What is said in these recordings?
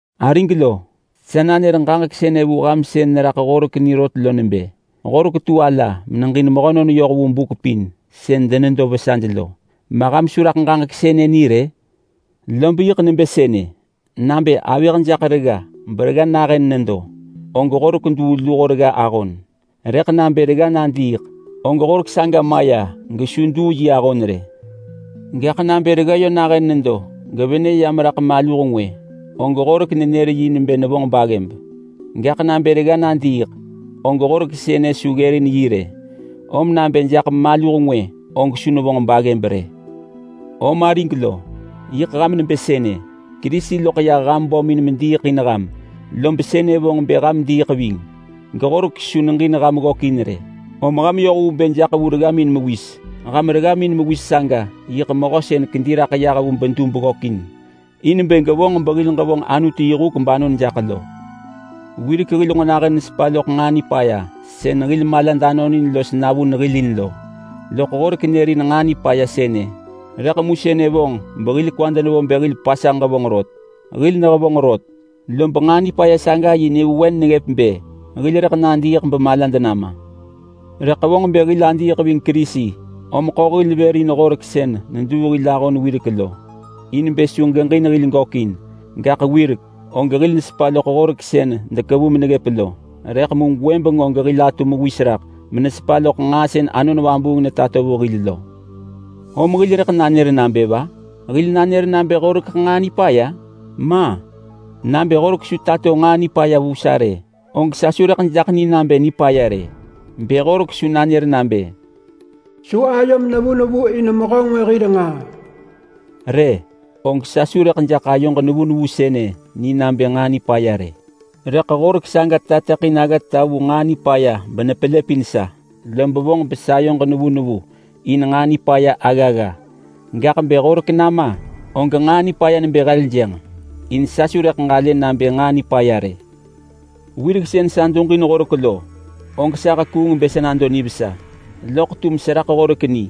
Arig lo, sa nanër ġaġek sënë vu ham sën neraḳ horek ni rot lo nebë: Horek tu ala meneġin mehönon yoh vu buk pin sën denedo vesaj lo. Ma ham su raḳ ġaġek sënë ni rë? Lob yiḳ nebë sënë: Nabë avëh jaḳ regga beregga nahën nedo, og horek duu luho regga ahon. Rëḳ nabë regga nadiiḳ, og horek saga maya gesu duu yi ahon rë. Gaḳ nabë regga yö nahën nedo gevenë ya meraḳ maluh ngwë, og horek nenër yi nebë nevonġ baggëb. Gaḳ nabë regga nadiiḳ, og horek sënë su ggërin yi rë, om nabë jaḳ maluh ngwë og su nevonġ baggëb rë. Om arig lo, yiḳ ham nebë sënë. Kerisi loḳ yah ham bömin mediiḳ in ham, lob sënë vonġ bë ham diiḳ ving geHorek su neġin ham ggökin rë, om ham yoh vu bë jaḳ vu reggamin mewis. Ham reggamin mewis saga yiḳ mehö sën kedi raḳ yah vu bedub ggökin in bë gevonġ behil ġevonġ Anutu yi huk banon jaḳ lo. Wirek hil nġo nahën nesepa loḳ nġaa nipaya sën hil malad anonin los navun hil in lo, loḳ horek nërin nġaa nipaya sënë, rëḳ mu sënë vonġ behil kwad nevo bë hil pasanġ ġevonġ rot. Hil nehevonġ rot, lob nġaa nipaya saga yi nyëvewen neggëp bë hil rëḳ nadiiḳ bemalad nama. Rëḳ vonġ bë hil adiiḳ ving Kerisi, om ḳo hil vër in Horek sën neduu hil ahon wirek lo, in bë su geġin hil gökin. Gaḳ wirek, og hil nesepa loḳ Horek sën dekevu meneggëp lo, rëḳ mu gwëbeng og hil atu mewis raḳ menesepa loḳ nġaa sën Anon Vabuung netato vu hil lo. Om hil rëḳ nanër nabë va? Hil nanër nabë Horekeḳ nġaa nipaya? Ma! Nabë Horek su tato nġaa nipaya vu sa rë, og sa su rëḳ jaḳ ni nabë nipaya rë. Bë Horek su nanër nabë, “Su ayom nevu nevu in mehö ngwë hir ngaa” rë, og sa su rëḳ jaḳ ayoġ nevu nevu sënë ni nabë nġaa nipaya rë. Rëḳ Horek saga tateḳin aggata vu nġaa nipaya benepelëpin sa, lob vonġ besayoġ nevu nevu in nġaa nipaya aggagga. Gaḳ bë Horek nama, og nġaa nipaya nebë heljënġ, in sa su rëḳ ġalë nabë nġaa nipaya rë. Wirek sën sa duġin Horek lo, og sa hekuung bë sa nado nivesa. Loḳ tum seraḳ Horek ni,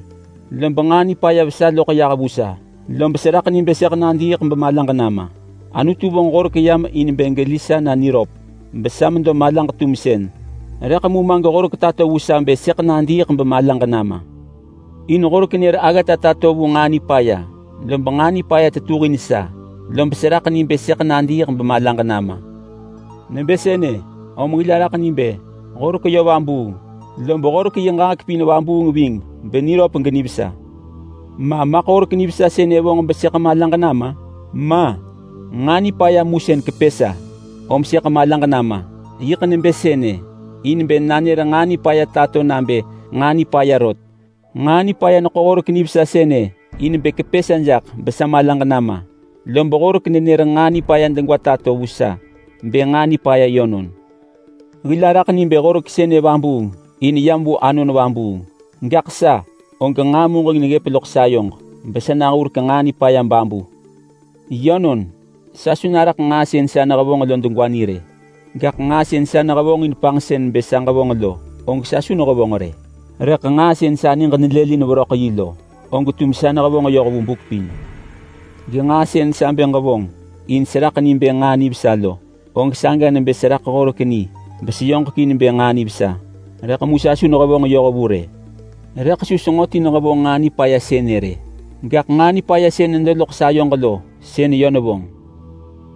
lob nġaa nipaya vesa loḳ yah vu sa, lob seraḳ ni bë sëḳ nadiiḳ bemalaġ nama. Anutu vonġ Horek yam in bë geli sa na niröp besa medo malaġ-tumsën, rëḳ mu ma geHorek tato vu sa bë sëḳ nadiiḳ bemalaġ nama. In Horek nër aggata tato vu nġaa nipaya, lob nġaa nipaya tetuhin sa, lob seraḳ ni bë sëḳ nadiiḳ bemalaġ nama. Nebë sënë, om hil araḳ ni bë Horek yö vabuung. Lob Horek yi ġaġek pin vabuung ving beniröp genivesa. Ma maḳ Horek nivesa sënë vonġ besëḳ malaġ nama? Ma! Nġaa nipaya mu sën kepë sa, om sëḳ malaġ nama. Yiḳ nebë sënë in bë nanër nġaa nipaya tato nabë nġaa nipaya rot. Nġaa nipaya neḳo Horek nivesa sënë in bë kepë sa jaḳ besa malaġ nama. Lob Horek nenër nġaa nipaya degwa tato vu sa bë nġaa nipaya yönon. Hil araḳ ni bë Horek sënë vabuung in yam vu Anon Vabuung. Gaḳ sa, og nġaa muġeng neggëp loḳ sayoġ besa nahurek nġaa nipaya babu. Yönon, sa su naraḳ nġaa sën sa nehevonġ lo degwa ni rë. Gaḳ nġaa sën sa nehevonġin panġsën bë sa ġevonġ lo, og sa su nehevonġ rë. Rëḳ nġaa sën sa niġ nelëlin veröḳ yi lo, og tum sa nehevonġ yoh vu buk pin. Genġaa sën sa bë ġevonġ in seraḳ ni bë nġaa nivesa lo, og saga nebë seraḳ Horek ni beseyoġekin bë nġaa nivesa, rëḳ mu sa su nehevonġ yoh vu rë. Rëḳ su senġo ti nehevonġ nġaa nipaya sënë rë, gaḳ nġaa nipaya sën nedo loḳ sayoġ lo sën yö nevonġ.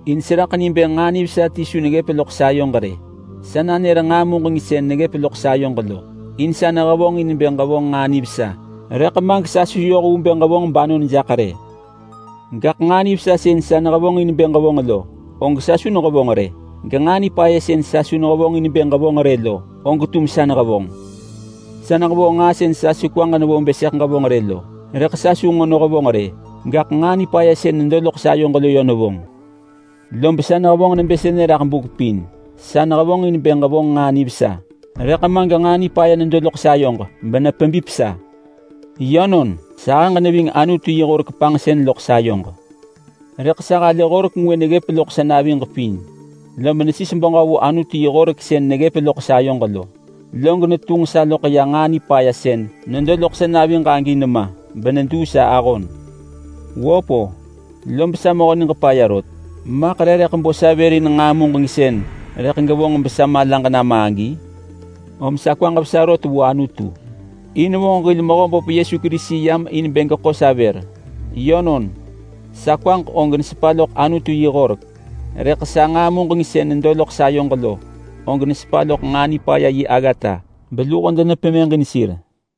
In seraḳ ni bë nġaa nivesa ti su neggëp loḳ sayoġ rë. Sa nanër nġaa muġeng sën neggëp loḳ sayoġ lo. In sa nehevonġin bë ġevonġ nġaa nivesa, rëḳ ma gesa su yoh vu bë ġevonġ banon jaḳ rë. Gaḳ nġaa nivesa sën sa nehevonġin bë ġevonġ lo, og sa su nehevonġ rë. Genġaa nipaya sën sa su nehevonġin bë ġevonġ rë lo, og tum sa nehevonġ. Sa nehevonġ nġaa sën sa su kwaġ nevo bë sëḳ ġevonġ rë lo, rëḳ sa su nġo nehevonġ rë, gaḳ nġaa nipaya sën nedo loḳ sayoġ lo yö nevonġ. Lob sa nehevonġ nebë sënë raḳ buk pin: Sa nehevonġin bë ġevonġ nġaa nivesa, rëḳ ma genġaa nipaya nedo loḳ sayoġ benepebip sa. Yönon, sahëġ neving Anutu yi horek panġsën loḳ sayoġ. Rëḳ sa halë horek ngwë neggëp loḳ sa naviġ pin. Lob nesis beġö vu Anutu yi horek sën neggëp loḳ sayoġ lo. Log netunġ sa loḳ ya nġaa nipaya sën nedo loḳ sa naviġ agi nema beneduu sa ahon. Wöp-o! Lob sa mehö niġ paya rot! Maḳ re rëḳ bo sa vër in nġaa muġeng sën rëḳ gevonġ besa malaġ nama agi? Om sa kwaġ vesa rot vu Anutu! In vonġ hil Mehöböp Yesu Kerisi yam in bë geḳo sa vër. Yönon, sa kwaġ og nesepa loḳ Anutu yi horek, rëḳ sa nġaa muġeng sën nedo loḳ sayoġ lo, og nesepa loḳ nġaa nipaya yi aggata beluho denepemëġin sir.